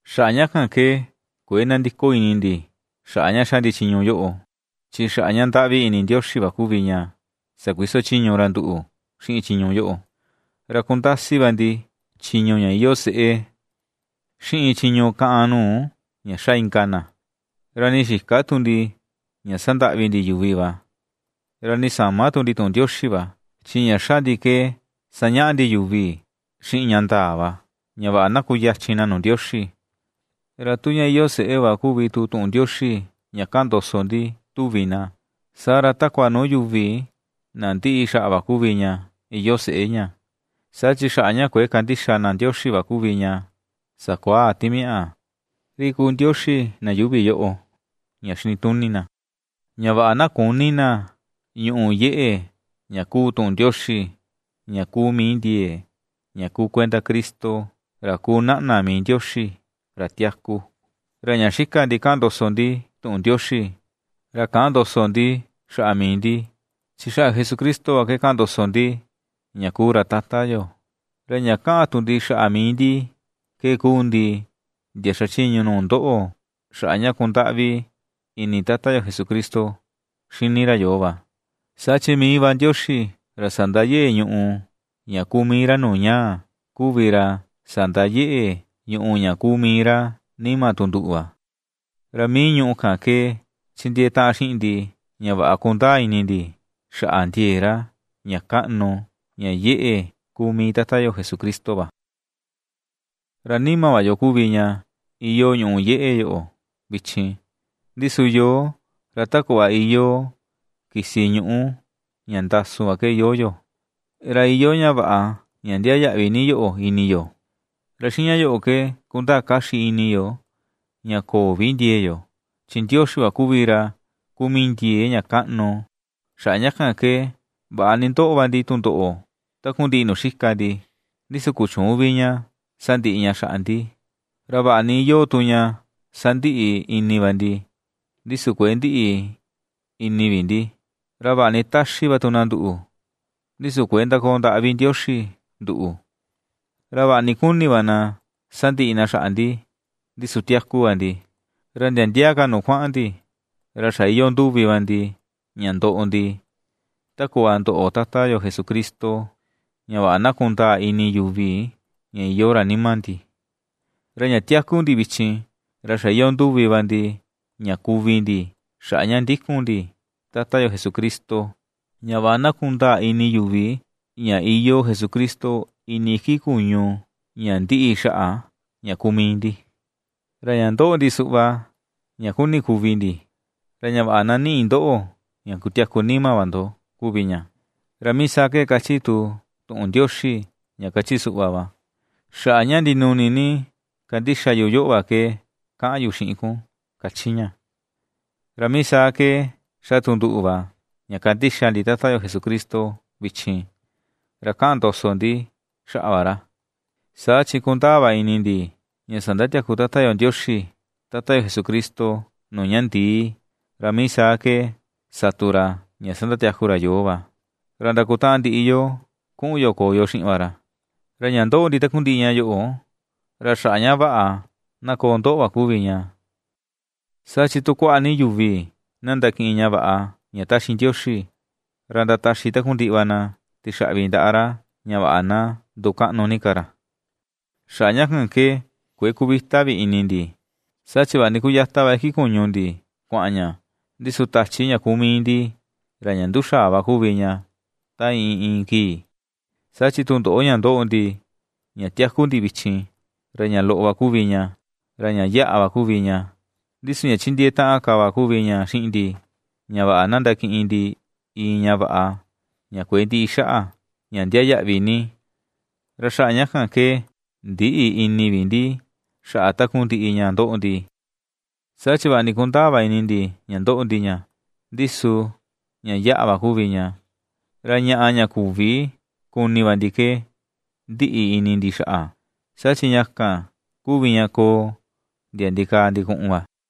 Xaꞌa ña kan ke kuëe nandiko ini ndi, xaꞌa ña xa ndi chiñu yoꞌo, chi xaꞌa ña ndaꞌvi ini Ndioxi va kuvi ña sakuiso chiñu ra nduꞌu xiꞌin chiñu yoꞌo. Ra kundasi va ndi chiñu ña iyoo seꞌe, xiꞌin chiñu kaꞌan nuu ña xa inka na; ra nii xïka tu ndi ña sandaꞌvi ndi yuvi va, ra nii säma tu ndi tuꞌun Ndioxi va. Chi ña ^xa ndi ke sañaꞌa ndi yuvi xiꞌin ña ndaa va, ña vaꞌa na kuyachin na nuu Ndioxi. Ra tu ña iyoo seꞌé va kuvi tu tuꞌun Ndioxi ña kaꞌan ndoso ndi tuvi na, saa ra takua nuu yuvi na ndiꞌi xaꞌa va kuvi ña iyoo seꞌé ña. Saa chi xaꞌa ña kuëe kandixa na Ndioxi va kuvi ña sakuaa timiaꞌa, ri kuu ndioxi na yuuvi yoꞌo, ña xinituni na, ña vaꞌa na küni na ñuꞌu yeꞌe ña kuu tuꞌun Ndioxi, ña kuu mii ndiee, ña kuu kuenda Cristo, ra kuu naꞌna mii Ndioxi, ra tiaku. Ra ña xika ndi kaꞌan ndoso ndi tuꞌun Ndioxi, ra käꞌan ndoso ndi xaꞌa mii ndi, chi xaꞌa Jesucristo va ke kaꞌan ndoso ndi ña kuu ra Tata yo; ra ña kaꞌan tu ndi xaꞌa mii ndi ke kuu ndi, ndia xachiñu nuu ndoꞌo xaꞌa ña kundaꞌvi ini Tata yo Jesucristo xini ra yoo va. Saa chi mii va Ndioxi, ra sandayeꞌe ñùꞌù ña kuu mii ra nuu ñaa, kuvi ra sandayeꞌe ñùꞌù ña kuu mii ra nima tu nduꞌu va, ra mii ñùꞌù kan ke chindiee taꞌan xiꞌin ndi ña vaꞌa kundaa ini ndi xaꞌa ndiee ra, ña kaꞌnu, ña yeꞌe kuu mii Tata yo Jesucristo va. Ra nima va yo kuvi ña, iyoo ñùꞌù ña yeꞌe yoꞌo, vichin, ndi su yoo ra ta kuꞌva iyoo kisi ñuꞌu ña ndasu va ke iyoo yo, ra iyoo ña vaꞌa ña ndiaa yaꞌvi ni yoꞌo ini yo. Ra xiꞌin ña yoꞌo ke kundaa kaxi ini yo ña köo vi ndiee yo, chi Ndioxi va kuvi ra kuu mii ndiee ña kaꞌnu. Xaꞌa ña kan ke, vaꞌa ni ndoꞌo va ndi tundoꞌo takundiꞌi nuu xika ndi, ndi su ^kuchüun vi ña sandiꞌi ña xaꞌa ndi, ra vaꞌa ni iyoo tu ña ^sandiꞌi ini va ndi, ndi su kuëe ndiꞌi ini vi ndi. Ra vaꞌa ni ^táxí tu na nduꞌu va, ndi su kuëe ndakoo ndaꞌa vi Ndioxi nduꞌu; ra vaꞌa ni kuni va na sandiꞌi na xaꞌa ndi, ndi su tiaku va ndi. Ra ndia ndia ka nuu kuaꞌan ndi, ra xa iyoo nduvi va ndi ña ndoꞌo ndi, ta kuꞌva ndoꞌo Tata yo Jesucristo, ña vaꞌa na kundaa ini yuvi ña iyoo ra nima ndi. Ra ña tiaku ndi vichin, ra xa iyoo nduvi va ndi ña kuvi ndi, xaꞌa ña ndikun ndi Tata yo Jesucristo, ña vaꞌa na kundaa ini yuvi ña iyoo Jesucristo ini iki kuñu ña ndiꞌi xaꞌa ña kuu mii ndi. Ra ña ndoꞌo ndi suꞌva ña kuni kuvi ndi, ra ña vaꞌa na niꞌi ndoꞌo ña kutiaku nima va ndo kuvi ña. Ra mii saa ke kachi tu tuꞌun Ndioxi, ña kachi suꞌva va: “Xaꞌa ña ndinuni ni kandixa yu yoꞌo va ke, kaꞌan yu xiꞌin kun”, kachi ña. Ra mii saa ke ^xa tu nduꞌu va ña kandixa ndi Tata yo Jesucristo vichin, ra kaꞌan ndoso ndi xaꞌa va ra. Saa chi kundaa va ini ndi, ña sandatiaku Tata yo Ndioxi, Tata Jesucristo nuu ña ndii, ra mii saa ke sa tu ra ña sandatiaku ra yoo va, ra ndakutaꞌan ndiꞌi yo kuꞌun yo koo yo xiꞌin va ra. Ra ña ndoꞌo ndi takundiꞌi ña yoꞌo, ra xaꞌa ña vaꞌa na koo ndoꞌo va kuvi ña. Saa chi tu kuaꞌa ni yuvi na ndakiꞌin ña vaꞌa ña ^taxi Ndioxi, ra ndataxi takundiꞌi va na tixaꞌvi ndaꞌa ra, ña vaꞌa na ndukaꞌnu ni ka ra. Xaꞌa ña kan ke, kuëe kuvita vi ini ndi, saa chi vaꞌa ni kuyata va iki kuñu ndi kuaꞌan ña, ndi su tachi ña kuu mii ndi, ra ña nduxaa va kuvi ña ta iin, iin kii. Saa chi tundoꞌo ña ndoꞌo ndi, ña tiaku ndi vichin, ra ña loꞌo va kuvi ña, ra ña yaꞌa va kuvi ña; ndi su ña chindiee taꞌan ka va kuvi ña xiꞌin ndi, ña vaꞌa na ndakiꞌin ndi iin ña vaꞌa ña kuëe ndiꞌi xaꞌa, ña ndiaa yaꞌvi ni. Ra xaꞌa ña kan ke ndïꞌi ini vi ndi xaꞌa takundiꞌi ña ndoꞌo ndi, saa chi vaꞌa ni kundaa va ini ndi ña ndoꞌo ndi ña, ndi su ña yaꞌa va kuvi ña; ra ñaꞌa ña küvi kuni va ndi ke ndiꞌi ini ndi xaꞌa, saa chi ña kan kuvi ña koo ndia ndikaa ndikuꞌun va.